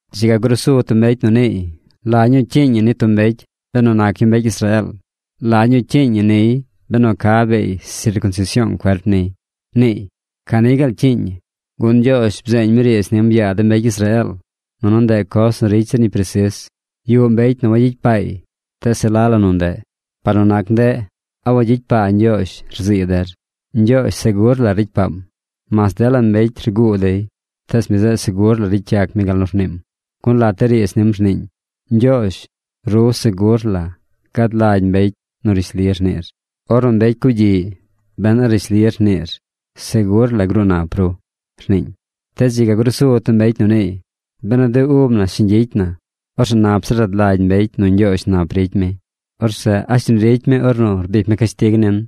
Dzi ga grusu tub mbecy nu niiy: “¿La ñuu cyiiñ ñi ni tub mbecy benu nac yu mbecy Israeel? ¿La ñuu cyiiñ ñi niy benu ca bee sircunsision cuerp niy?” niiy. Ca ni gaal cyiiñ ñi, gun Ñgyoozh bzeeñ mi riidz nim yaa de mbecy Israeel. Nunu ndeꞌ coz nu ricy zir ñi presis. Yuꞌ mbecy nu wangyicy paay, tees se la la nu ndeꞌ. Par nu nac ndeꞌ, ¿a wagyicy paa Ñgyoozh, rzii der? Ñgyoozh segur la ricy paam. Mas dela mbecy rguu dey, tees mi zeꞌ segur la ricy yac mi gal nu rniim, gun lat de riidz nim rniiñ: Ñgyoozh, ru segur la gad lagy mbecy nu rishli rniir. Ornu mbecy cugyiꞌy ben a rishli rniir, segur la gruu nap ru, rniiñ. Tees dzi ga grusu tub mbecy nu niiy: “Benu de ub na shiñ gyicy na, orzeꞌ nap zir rad lagy mbecy nu Ñgyoozh nap ricy mi. Orzeꞌ ¿a shiñ ricy mi ornu rbic mi cashtig nin?”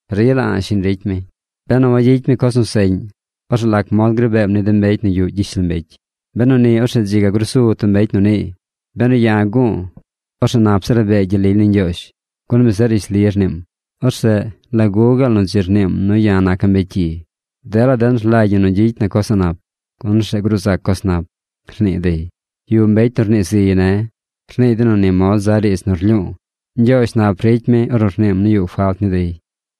Rila a̱ꞌ shiñ ricy mi. Benu wagyicy mi coz nu seꞌñ, orzeꞌ ¿lac mod gri beem ni de mbecy nu yuꞌ gyishlombecy? Beni orzeꞌ dzi ga grusu tub mbecy nu niiy: “Benu ya̱ gu̱u̱, orzeꞌ nap zir rabee gyel lily ni Ñgyoozh, gun mi zeꞌ rishli rniim. Orzeꞌ ¿lagu gaal nu dzi rniim nu ya̱ naca̱ mbecy cyi? Dela den rlagy ñi nu gyicy na coz a̱ꞌ nap, gun orzeꞌ gruu zac coz nap”, rnii dey. Yuꞌ mbecy nu rnii ziy ne̱. Rnii dey nu ni mod za riidz nu rlyu̱u̱. Ñgyoozh nap ricy mi ornu rniim nu yuꞌ falt ni dey.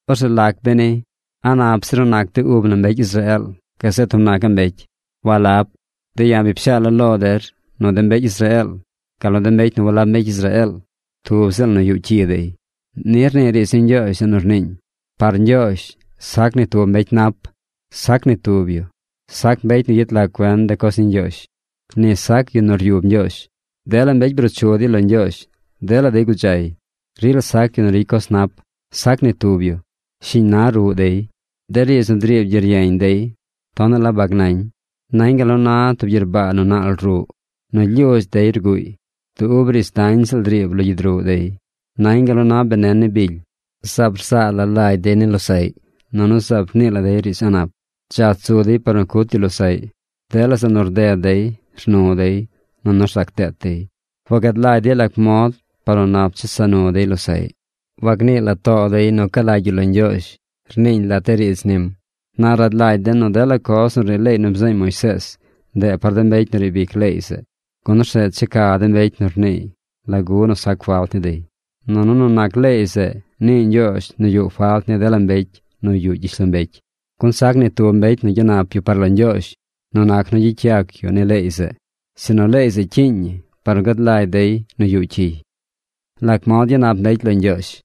Orzeꞌ ¿lac beni? ¿A nap zir nu nac de ub na mbecy Israeel gazeꞌ tub nacaꞌ mbecy? ¡Walab! De ya̱ bi pshaala̱ lo der nu de mbecy Israeel gal nu de mbecy nu walab mbecy Israeel, tub ziꞌl nu yuꞌ cyi dey. Ni rnii riidz ni Ñgyoozh zeꞌ nu rniiñ: ¡Par Ñgyoozh, sac ni tub mbecy nap! ¡Sac ni tub yu! Sac mbecy nu yet lag cuen de coz ni Ñgyoozh. Ni sac yu nu ryub Ñgyoozh. Dela mbecy bruu chu dey lo Ñgyoozh. Dela dey gudzay. ¡Rila sac yu nu ricy coz nap! ¡Sac ni tub yu! Shiñ na ruꞌ dey. De riidz nu driib gyeryeñ dey tonaꞌ la bag nañ. Nañ gal nu na tub gyerbaa nu naal ruꞌ. Nu lyudz dey rguuy. Du ub riidz dañ ziꞌl driib lo gyid ruꞌ dey. Nañ gal nu na benen ni bily. Zaab rzaa la lagy dey ni losaꞌy. Nunu zaab rnii la dey riidz a̱ꞌ nap. Dzach zu dey par nu cut yu losaꞌy. Dela zeꞌ nu rded dey, rnu dey, nunu rzac deet dey. Wagad lagy dey lac mod par nu nap chesa nu dey losaꞌy. Wagnii la too dey nu ca lagy yu lo Ñgyoozh, rniiñ lat de riidz nim. Na rad lagy den nu dela coz nu rnii leey nu bzeeñ Moisees, ndeꞌ par de mbecy nu riib ic leey zeꞌ, gun orzeꞌ checa de mbecy nu rniiy lagu nu sac falt ni dey, nunu nu nac leey zeꞌ nii Ñgyoozh nu yuꞌ falt ni dela mbecy nu yuꞌ gyishlombecy. Gun sac ni tub mbecy nu gyanap yu par lo Ñgyoozh nu nac nu gyicy yac yu ni leey zeꞌ, sinu leey zeꞌ cyiiñ ñi par nu gad lagy dey nu yuꞌ cyiy. ¿Lac mod gyanap mbecy lo Ñgyoozh?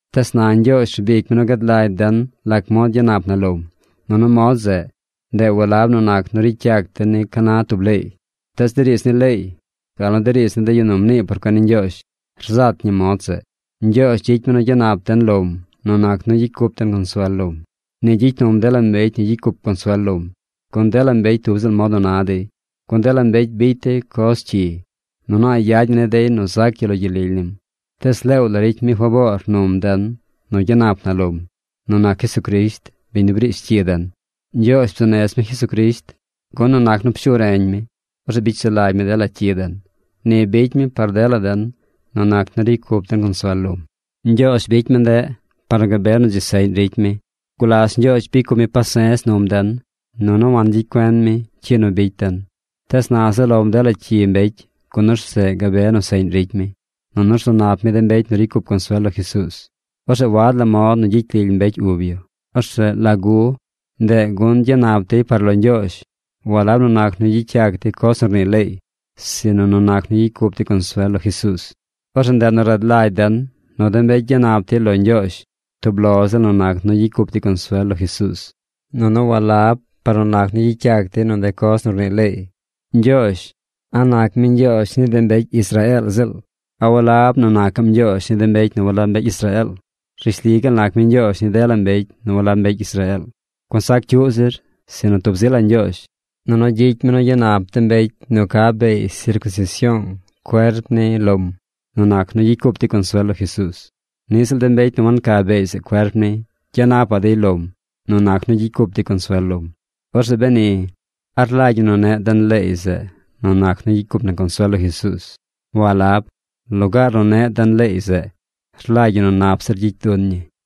Tees na Ñgyoozh rbic mi nu gad lagy den lac mod gyanap na lom, nunu mod zeꞌ, ndeꞌ walab nu nac nu ricy yac den ni ca na tub leey. Tees de riidz ni leey, gal nu de riidz ni de yu nu mnii por cuen ni Ñgyoozh rzat ñi mod zeꞌ. Ñgyoozh gyicy mi nu gyanap den lom nu nac nu gyicy cup den consuel lom. Ni gyicy num dela mbecy nu gyicy cup consuel lom, gun dela mbecy tub ziꞌl mod nu na dey. Gun dela mbecy bicy dey coz cyi, nunu a̱ꞌ yad ñi ni dey nu zac yu lo gyel lily nim. Tees leew la ricy mi faboor num den nu gyanap na lom, nu nac Jesucrisht, biñ nu briish cyi den. Ñgyoozh bzuu nez mi Jesucrisht, gun nu nac nu pshu reñ mi, orzeꞌ bicy sulagy mi dela cyi den. Ni bicy mi par dela den nu nac nu ricy cup den consuel lom. Ñgyoozh bicy mi ndeꞌ par nu gabe nu dzi seꞌñ ricy mi. Gulas Ñgyoozh bicy cup mi pase̱z num den, nunu wangyicy cuen mi cyi nu bicy den. Tees na zaꞌ lom dela cyi mbecy, gun orzeꞌ gabe nu seꞌñ ricy mi, nunu rzu nap mi de mbecy nu ricy cup consuel lo Jesuuz. Orzeꞌ wad la mod nu gyicy lily mbecy ub yu. Orzeꞌ ¿lagu? Ndeꞌ gun gyanap dey par lo Ñgyoozh walab nu nac nu gyicy yac dey coz nu rnii leey, sinu nu nac nu gyicy cup dey consuel lo Jesuuz. Orzeꞌ ndeꞌ nu rad lagy den nu de mbecy gyanap dey lo Ñgyoozh tub lo ziꞌl nu nac nu gyicy cup dey consuel lo Jesuuz, nunu walab par nu nac nu gyicy yac dey nu de coz nu rnii leey. Ñgyoozh, ¿a nac mi Ñgyoozh ni de mbecy Israeel ziꞌl? ¿A walab nu nacaꞌm Ñgyoozh ni de mbecy nu walab mbecy Israeel? Rishli gaal nac mi Ñgyoozh ni dela mbecy nu walab mbecy Israeel. Gun sac cyuꞌ zir, sinu tub zi la Ñgyoozh. Nunu gyicy mi nu gyanap de mbecy nu ca beey sircunsision cuerp ni lom nu nac nu gyicy cup dey consuel lo Jesuuz. Niꞌ ziꞌl de mbecy nu wanca beey zeꞌ cuerp ni, gyanapaꞌ dey lom nu nac nu gyicy cup dey consuel lom. Orzeꞌ beni, ¿a rlagy ñi nu neꞌ den leey zeꞌ nu nac nu gyicy cup na consuel lo Jesuuz? ¡Walab! Lugaar nu neꞌ den leey zeꞌ, rlagy ñi nu nap zir gyicy dun ñii.